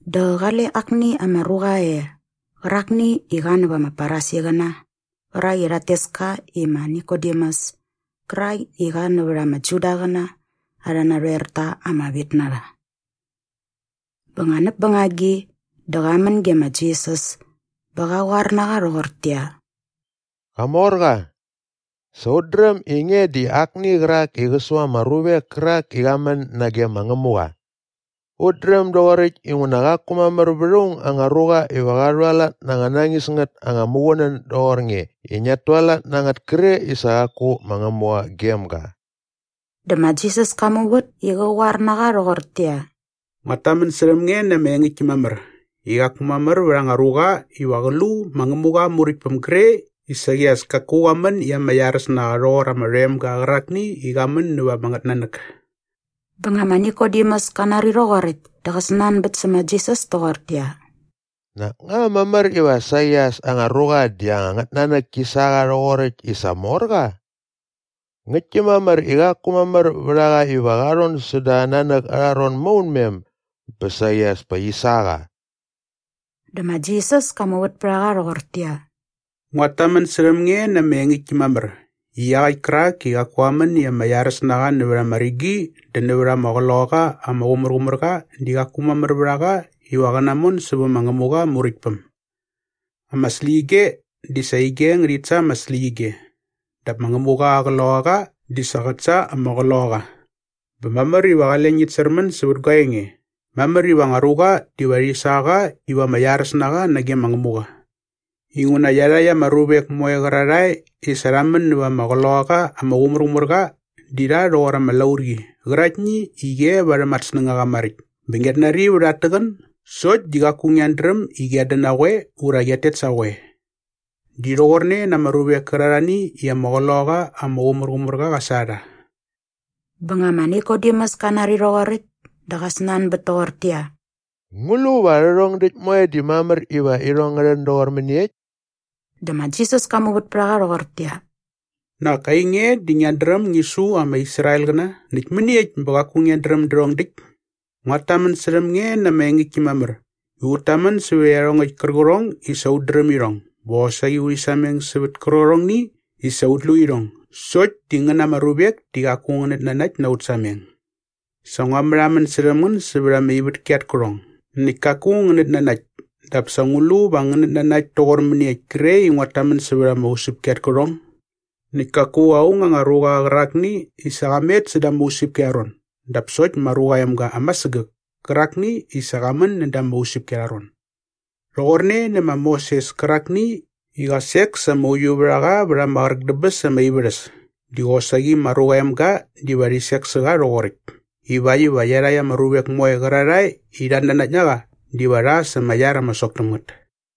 Dä qale akni ama ruqa e qärakni i qa nävät ama Farisiqäna qärak i rhat tes ka i ma Nikodemus kärak i qa nävät ama Judaqäna arhä narhoerta ama vit na rha. Bä nga näp bängagi dä qa män ge ma Jisas bä qa qoar na qa rhoqortäqyia, “Qamorqa, sa ut dräm i nge di akni qärak i qä su ama ruvek kärak i qa män nage ma Ngämuqa. Ut dräm doqoräkt inguna qaku mamär vät aung anga ruqa iva qa rhualat na anga nañis ngät anga muqunän doqor nge i ngiat tualat na ngät kre i sa qaku ma Ngämuqa gem ga.” Dä ma Jisas ka muvät i qä qoar na qa rhoqortäqyia, “Nguat tamän särhäm nge na ama engäktki mamär i qaku mamär vät anga ruqa iva qä lu ma Ngämuqa aa Muräktpäm gre i saqi as kaku qa män i ama iaräs na qa rhoqor ama rhoemga qärakni i qa män näva ama ngätnanäk.” Bä nga ma Nikodemus ka nari rhoqoräkt dä qa snanbät sä ma Jisas toqortäqyia, “Nak nga mamär iva saqi as anga ruqa di anga ngätnanäk ki sa qa rhoqoräkt i sa mor qa? Ngäktki mamär i qaku mamär vät a qa iva qa rhon säda aa nanäk arha ron maunmen bä saqi as pa qi sa qa.” Dä ma Jisas ka muvät pät a qa rhoqortäqyia, “Nguat tamän särhäm nge na ama engäktki mamär i iaqäkt kärak i qaku qa män i ama iaräs na qa nävät ama rigi dä nävät ama Qloqaqa ama Qumärqumärqa di qaku mamär vät a qa iva qä namon sävä ma Ngämuqa aa Muräktpäm. Ama släqyige di sa ige ngärhit sa ama släqyige dap ma Ngämuqa aa Qloqaqa di sa qät sa ama qloqaqa. Bä mamär iva qale ngit särmän sävät gua enge, ‘Mamär iva anga ruqa diva rhi sa qa iva ama iaräs na qa nage ma Ngämuqa.’ Inguna ama iarhakt ama ruvek moe qärarhae i sa rha män näva ama Qloqaqa ama Qumärqumärqa di rha rhoqor ama laurqi qäraktni i qi e varhäm at snängaqa maräkt bä ngiat nari vät at täqän sokt di qaku ngiat dräm i qiat dän na qoe ura qiat tet sa qoe. Di rhoqorne na ama ruvek kärarhani i ama Qloqaqa ama Qumärqumärqa qa sa rha.” Bä nga ma Nikodemus ka nari rhoqoräkt dä qa snanbät toqortäqyia, “Ngu lu va rhärhong däkt moe di mamär iva irhong ngä rhän doqor mäniekt?” Dä ma Jisas ka muvät pät a qa rhoqortäqyia, “Nak ainge di ngiat dräm ngi su ama Israelqäna näkt mäniekt bä qaku ngiat dräm därhong däkt? Nguat tamän särhäm nge na ama engäktki mamär i ut tamän sävät iarhongäkt kärqärhong i sa ut dräm irhong bä qosaqi urhi sameng sävät kärqärhongni i sa ut lu irhong sokt di ngän ama ruvek di qaku ngänät nanakt na ut sameng. Sa ngua märhamän särhäm ngän sävät ama ivätki at kärhong näkt kaku ngänät nanakt dap sa ngu lu va ngänät nanakt toqor mäniekt kre i nguat tamän sävät ama usäpki at kärhong? “Näkt kaku aung anga ruqa qärakni i sa qa met säda ama usäpki arha ron dap sokt ma Ruqa aa Emga ama sägäk kärakni i sa qa män näda ama usäpki arha ron. Rhoqorne nä ma Moses kärakni i qa sek sa ama uiuvärhaqa vät ama qräk dä bäs ama ivärhäs di qosaqi ma Ruqa aa Emga diva rhi sek sä qa rhoqoräkt ivakt iva iarhakt ama ruvek moe qärarhae i rhat nanakt na qa diva rha sa ama iar ama sok täm ngät.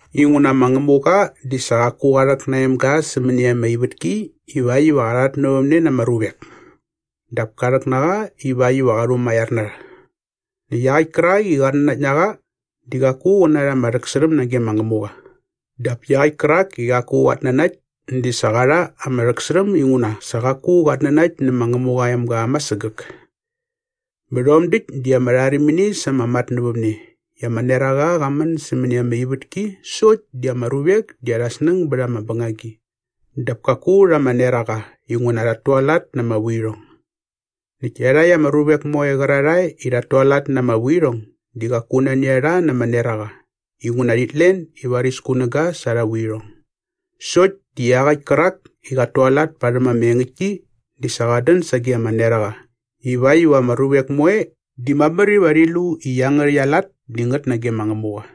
Inguna ma Ngämuqa di sa qaku qa rhäk na aa emga sämäni ama ivätki ivakt iva qa rhatnävämne na ama ruvek dap ka rhäk na qa ivakt iva qa rhumaiar na rha. Näkt iaqäkt kärak i qat nanakt na qa di qaku qä narha ama rhäksärhäm nage ma Ngämuqa dap iaqäkt kärak i qaku qat nanakt di sa qa rha ama rhäksärhäm inguna sa qaku qat nanakt nä ma Ngämuqa aa emga ama sägäk. “Bä rhom däkt di ama rharimini sa ama matnävämne i ama neraqa qa män sämäni ama ivätki sokt di ama ruvek di arhä snäng bät ama bängagi dap kaku rha ama neraqa inguna rhat tualat na ama vuirhong. Näkt iarhakt ama ruvek moe qärarhae i rhat tualat na ama vuirhong di qaku nani a rha na ama neraqa inguna rhit len i varis kunäga sa arha vuirhong. Sokt di iaqäkt kärak i qat tualat parhäm ama engäktki di sa qat dän sage ama neraqa ivakt iva ama ruvek moe di mamär iva rhi lu i iangärhäkt aa lat di ngät nage ma Ngämuqa.”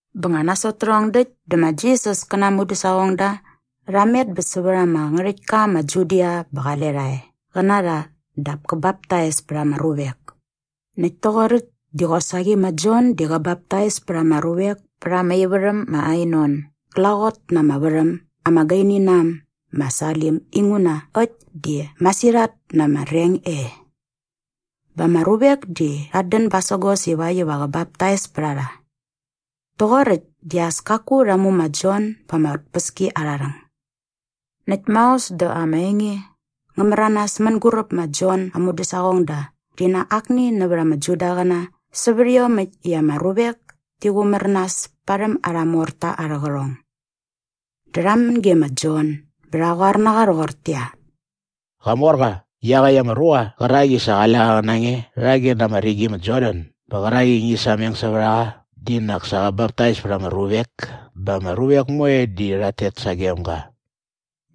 Bä nga nasot tärhong däkt dä ma Jisas kä na aa mudäsaqongda rha met bä sävät ama ngärhäktka ma Judia bä qale qa e qä na rha dap kä baptais pät ama ruvek. Näkt toqoräkt di qosaqi ma Jon di qä baptais pät ama ruvek pät ama ivärhäm ma Ainon glaqot na ama värhäm ama gaini na äm ma Salim inguna äkt di masirhat na ama reng e. Bä ama ruvek di rhat dän basägos ivakt iva qä baptais pät a rha. Rhoqoräkt di as kaku rha mu ma Jon ba ama tpäskiarharhäng. Näkt maos dä ama enge ngä märanas mänguräp ma Jon aa mudäsaqongda rhi na akni nävät ama Judaqäna sävät iomäkt i ama ruvek ti qumär nas parhäm arha morta arhä qärhong. Dä rha män ge ma Jon bä rha qoar na qa rhoqortäqyia, “Qamorqa, iaqäkt ama ruqa qärak i sa qale qa qä na nge rhage na ama rigi ma Jordan bä qärak i ngi sameng sävät a qa di nak sa qä baptais pät ama ruvek bä ama ruvek moe di rhat tet sagem ga.”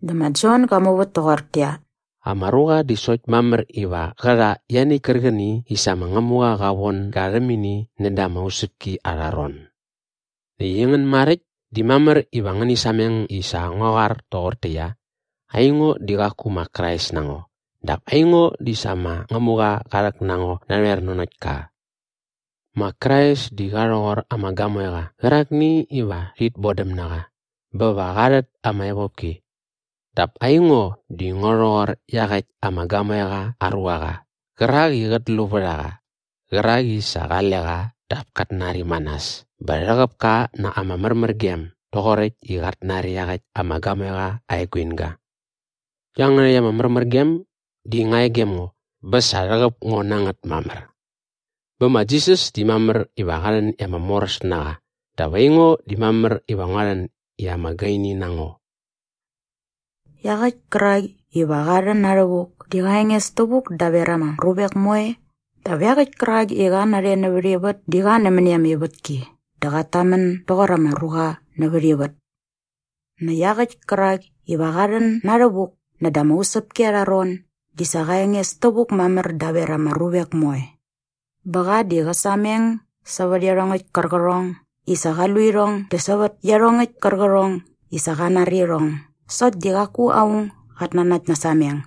Dä ma Jon ga muvät toqortäqyia, “Ama ruqa di sokt mamär iva qä rha ianiäkt kärqäni i sa ma Ngämuqa qa von ga rhäm ini näda ama usäpki arha ron. Näkt aingän maräkt di mamär iva ngäni sameng i sa ngua qoar toqortäqyia, ‘Aingo di qaku ma Krais na ngo dap aingo di sa ma Ngämuqa qa rhäk na ngo narhoer nanokt ka.’ “Ma Krais di qa rhoqor ama gamoeqa qärakni iva rhit bodäm na qa bä qa va rhät ama evopki. Dap aingo di ngo rhoqor iaqäkt ama gamoeqa aa ruaqa qärak i qät lu vät a qa qärak i sa qale qa dap kat nari ma nas bä rhäqäp ka na ama märmärgem doqoräkt i qat nari iaqäkt ama gamoeqa aa eguinga. Iangärhäkt ama märmärgem di nga e gem ngo bä sa rhäqäp ngo na ngät mamär. Bä ma Jisas di mamär iva qa rhän i ama moräs na qa dap aingo di mamär iva ngua rhän i ama gaini na ngo.” Iaqäkt kärak iva qa rhän na rhävuk di qa enges tävuk daver ama ruvek moe dap iaqäkt kärak i qa narhe nävät ivät di qa nämäni ama ivätki dä qat tamän doqor ama ruqa nävät ivät. Näkt iaqäkt kärak iva qa rhän na rhävuk näda ama usäpki arha ron di sa qa enges tävuk mamär daver ama ruvek moe. Bä qa di qä sameng sävät iarhongäkt kärqärhong i sa qa lu irhong dä sävät iarhongäkt kärqärhong i sa qa nari irhong sokt di qaku aung gat nanakt na aa sameng.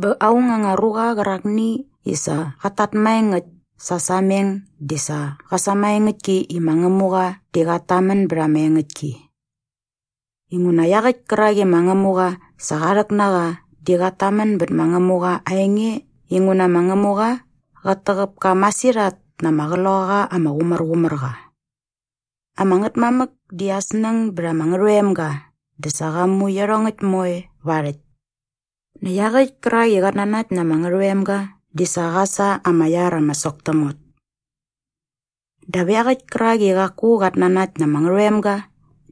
Bä aung anga ruqa qärakni i sa qat tat maengäkt sa aa sameng di sa qä sämaengäktki i ma Ngämuqa di qat tamän bät ama engäktki. Inguna iaqäkt kärak i ma Ngämuqa sa qa rhäk na qa di qat tamän bät ma Ngämuqa aa enge inguna ma Ngämuqa qät täqäp ka masirhat na ama Qloqaqa ama Qumärqumärqa. Ama Ngätmamäk di aa snäng bät ama Ngärhoemga dä sa qa mu iarhongäkt moe va aa rhäkt. Näkt iaqäkt kärak i qat nanakt na ama Ngärhoemga di sa qa sa ama iar ama sok täm ngät. Dap iaqäkt kärak i qaku qat nanakt na ama Ngärhoemga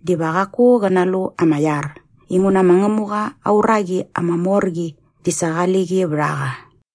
diva qaku qä nalu ama iar inguna ma Ngämuqa aa uraqi ama mor qi di sa qali qi vät a qa.